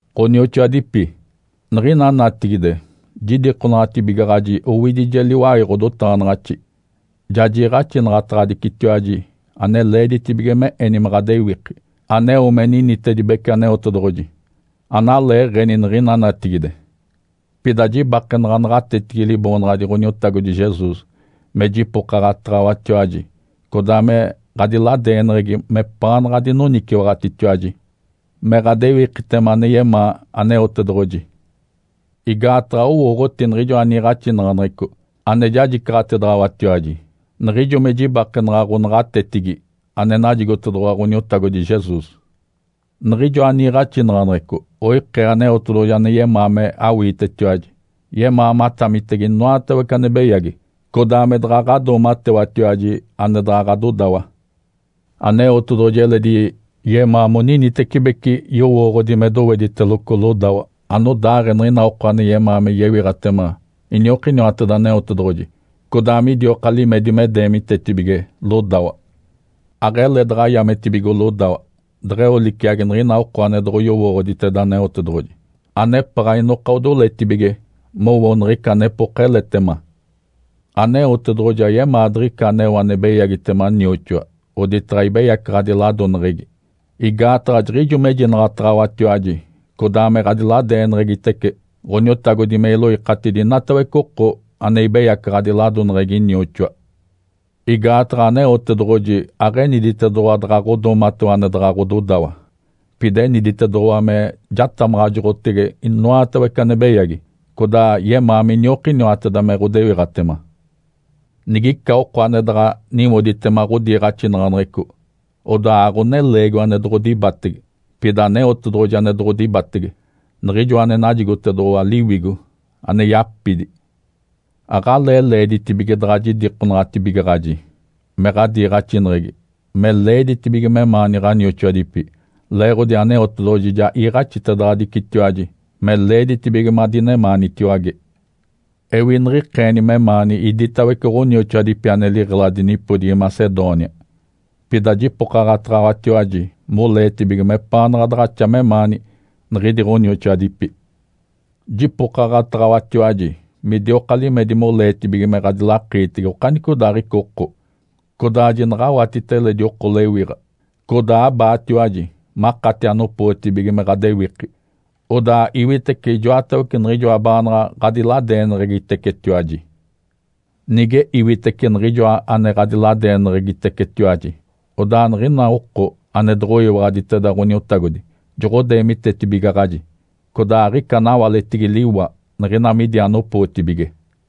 Ǥonioxoadipi. Niɡ̶ina natigide jidikonaɡ̶atibigaɡ̶aji owidije liwai ɡ̶odotaɡ̶anaɡ̶axi. Ja jiiɡ̶axinaɡ̶ataɡ̶adicitiwaji ane leeditibige me eni me ɡ̶adewiki aneo me ninitedibece Aneotedoɡ̶oji, analeeɡ̶eni niɡ̶ina natigide. Pida jibakenaɡ̶a naɡ̶atetigi Liboonaɡ̶adi Ǥoniotagodi Jesus me jipokaɡ̶ataɡ̶awatiwaji codaa me ɡ̶adiladeeneɡ̶egi mepaanaɡ̶a adinoniciwaɡ̶atitiwaji me ɡ̶adewikitema ane yemaa Aneotedoɡ̶oji. Igaataɡ̶a owooɡ̶oti niɡ̶ijoa niiɡ̶axinaɡ̶aneɡ̶eco ane jajicaɡ̶atedaɡ̶awatiwaji, niɡ̶ijo me jibakenaɡ̶a ɡ̶onaɡ̶atetigi ane najigotedoɡ̶owa Ǥoniotagodi Jesus. Niɡ̶ijoa niiɡ̶axinaɡ̶aneɡ̶eco oikee Aneotedoɡ̶oji ane yemaa me awiitetiwaji. Yemaa matamitege inoatawece ane beyagi, codaa me daɡ̶a ɡ̶adoomatewatiwaji ane daɡ̶a ɡ̶adodawa. Aneotedoɡ̶oji eledi yemaa moninitecibeci yowooɡ̶odi me dowediteloco lodawa anodaaɡ̶ee niɡ̶ina oko ane yemaa me yewiɡ̶atema iniokiniwateda Aneotedoɡ̶oji, codaa midioka limedi me deemitetibige lodawa. Aɡ̶ele daɡ̶a yametibigo lodawa deɡ̶eo liciagi niɡ̶ina oko ane doɡ̶oyowooɡ̶oditeda Aneotedoɡ̶oji, anepaɡ̶a inoka odoletibige mowo niɡ̶ica anepoka eletema. Aneotedoɡ̶oji ayemaa diɡ̶ica aneo ane beyagitema nioxoa oditaɡ̶a ibeyacaɡ̶adi ladoneɡ̶egi. Igaataɡ̶a jiɡ̶ijo mejinaɡ̶ataɡ̶awatiwaji codaa me ɡ̶adiladeeneɡ̶egitece Ǥoniotagodi me iloikatidi inatawece oko ane ibeyacaɡ̶adi ladoneɡ̶egi nioxoa. Igaataɡ̶a Aneotedoɡ̶oji aɡ̶eniditedoɡ̶owa daɡ̶a ɡ̶odoomatewa ane daɡ̶a ɡ̶ododawa, pida eniditedoɡ̶owa me jatamaɡ̶ajoɡ̶otege inoatawece ane beyagi, codaa yemaa miniokiniwateda me ɡ̶odewiɡ̶atema. Nigica oko ane daɡ̶a niwoditema ɡ̶odiiɡ̶axinaɡ̶aneɡ̶eco, odaa aɡ̶oneleegiwa ane doɡ̶odibatege, pida Aneotedoɡ̶oji ane doɡ̶odibatege, Niɡ̶ijoa ane najigotedoɡ̶owa Liwigo ane yapidi. Aɡ̶alee leeditibige daɡ̶a jidikonaɡ̶atibigaɡ̶aji me ɡ̶adiiɡ̶axineɡ̶egi me leeditibige memaani ɡ̶anioxoadipi, leeɡ̶odi Aneotedoɡ̶oji ja iiɡ̶axitedaɡ̶adicitiwaji me leeditibige madinemaanitiwage. Ewi niɡ̶ikeeni memaani iditawece ɡ̶onioxoadipi ane liɡ̶eladi nipodigi Macedônia. Pida jipokaɡ̶ataɡ̶awatiwaji moleetibige mepaanaɡ̶a daɡ̶axa memaani niɡ̶idi ɡ̶onioxoadipi. Jipokaɡ̶ataɡ̶awatiwaji midioka limedi moleetibige me ɡ̶adilakiitege okanicodaaɡ̶ica oko, codaa jinaɡ̶awatita eledi oko lewiɡ̶a, codaa abaatiwaji makati anopootibige me ɡ̶adewiki, odaa iwitece ijoatawece niɡ̶ijoa baanaɡ̶a ɡ̶adiladeeneɡ̶egitecetiwaji. Nige iwitece niɡ̶ijoa ane ɡ̶adiladeeneɡ̶egitecetiwaji, odaa niɡ̶ina oko ane doɡ̶oyiwaɡ̶aditeda Ǥoniotagodi joɡ̶odeemitetibigaɡ̶aji, codaa aɡ̶ica anawaletigi liwa niɡ̶ina midi anopootibige.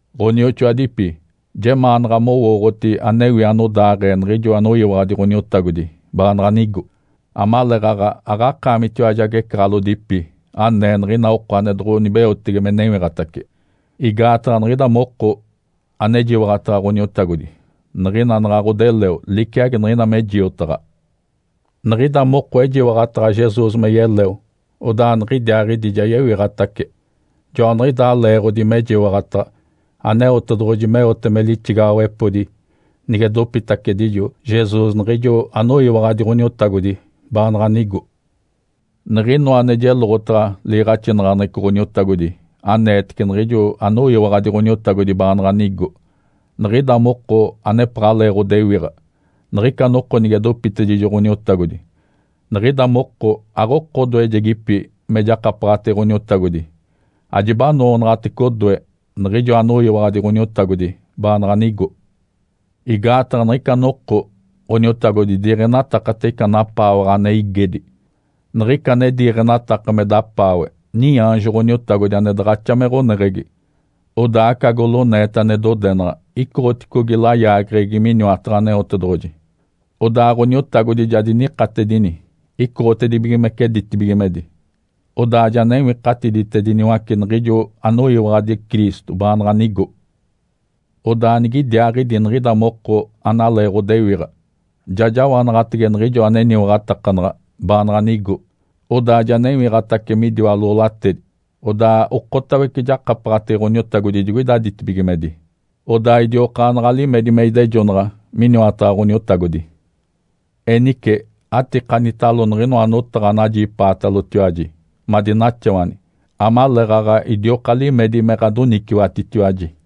Ǥonioxoadipi. Jemaanaɡ̶a mowooɡ̶oti anewi anodaaɡ̶ee niɡ̶ijo anoyiwaɡ̶adi Ǥoniotagodi baanaɡ̶a nigo, amaleeɡ̶aɡ̶a aɡ̶akaamitiwaji agecaɡ̶alodipi anee niɡ̶ina oko ane doɡ̶onibeotege me newiɡ̶atace. (Igaataɡ̶a niɡ̶ida moko anejiwaɡ̶ataɡ̶a Ǥoniotagodi niɡ̶ina naɡ̶a ɡ̶odeleo liciagi niɡ̶ina me jiotaɡ̶a.) Niɡ̶ida moko ejiwaɡ̶ataɡ̶a Jesus me yeleo, odaa niɡ̶idiaaɡ̶idi ja yewiɡ̶atace. Joaniɡ̶idaa leeɡ̶odi mejiwaɡ̶ataɡ̶a Aneotedoɡ̶oji meote me lixigaɡ̶awepodi nige dopitacedijo Jesus niɡ̶ijo anoyiwaɡ̶adi Ǥoniotagodi baanaɡ̶a nigo. Niɡ̶inoa ane jeloɡ̶otaɡ̶a liiɡ̶axinaɡ̶aneɡ̶eco Ǥoniotagodi aneetece niɡ̶ijo anoyiwaɡ̶adi Ǥoniotagodi baanaɡ̶a nigo. Niɡ̶ida moko anepaɡ̶alee ɡ̶odewiɡ̶a niɡ̶ica noko nige dopitedijo Ǥoniotagodi, niɡ̶ida moko aɡ̶oko odoejedipi me jakapaɡ̶atege Ǥoniotagodi ajibanoonaɡ̶atece odoe niɡ̶ijo anoyiwaɡ̶adi Ǥoniotagodi baanaɡ̶a nigo. Igaataɡ̶a niɡ̶ica noko Ǥoniotagodi diiɡ̶enatakate ica napaawaɡ̶a ane igedi, niɡ̶ica ane diiɡ̶enataka me dapaawe niaanjo Ǥoniotagodi ane daɡ̶axa me ɡ̶oneɡ̶egi, odaa aca goloneeta ane dodenaɡ̶a icoɡ̶oticogi layaageɡ̶egi miniwataɡ̶a Aneotedoɡ̶oji. Odaa Ǥoniotagodi ja dinikatedini icoɡ̶otedibigimece ditibigimedi. Odaa ja newikatiditediniwace niɡ̶ijo anoyiwaɡ̶adi Cristo baanaɡ̶a nigo. Odaa nigidiaaɡ̶idi niɡ̶ida moko analee ɡ̶odewiɡ̶a ja jawanaɡ̶atege niɡ̶ijo aneniwaɡ̶atakanaɡ̶a baanaɡ̶a nigo odaa ja newiɡ̶atace midiwa loolatedi. Odaa okotawece jakapaɡ̶atege Ǥoniotagodi digoida ditibigimedi. Odaa idiokaanaɡ̶a limedi me idejonaɡ̶a miniwataɡ̶a Ǥoniotagodi. Enice atikanitalo niɡ̶inoa notaɡ̶a anajipaatalotiwaji madinaxawani amaleeɡ̶aɡ̶a idioka limedi me ɡ̶adoniciwatitiwaji.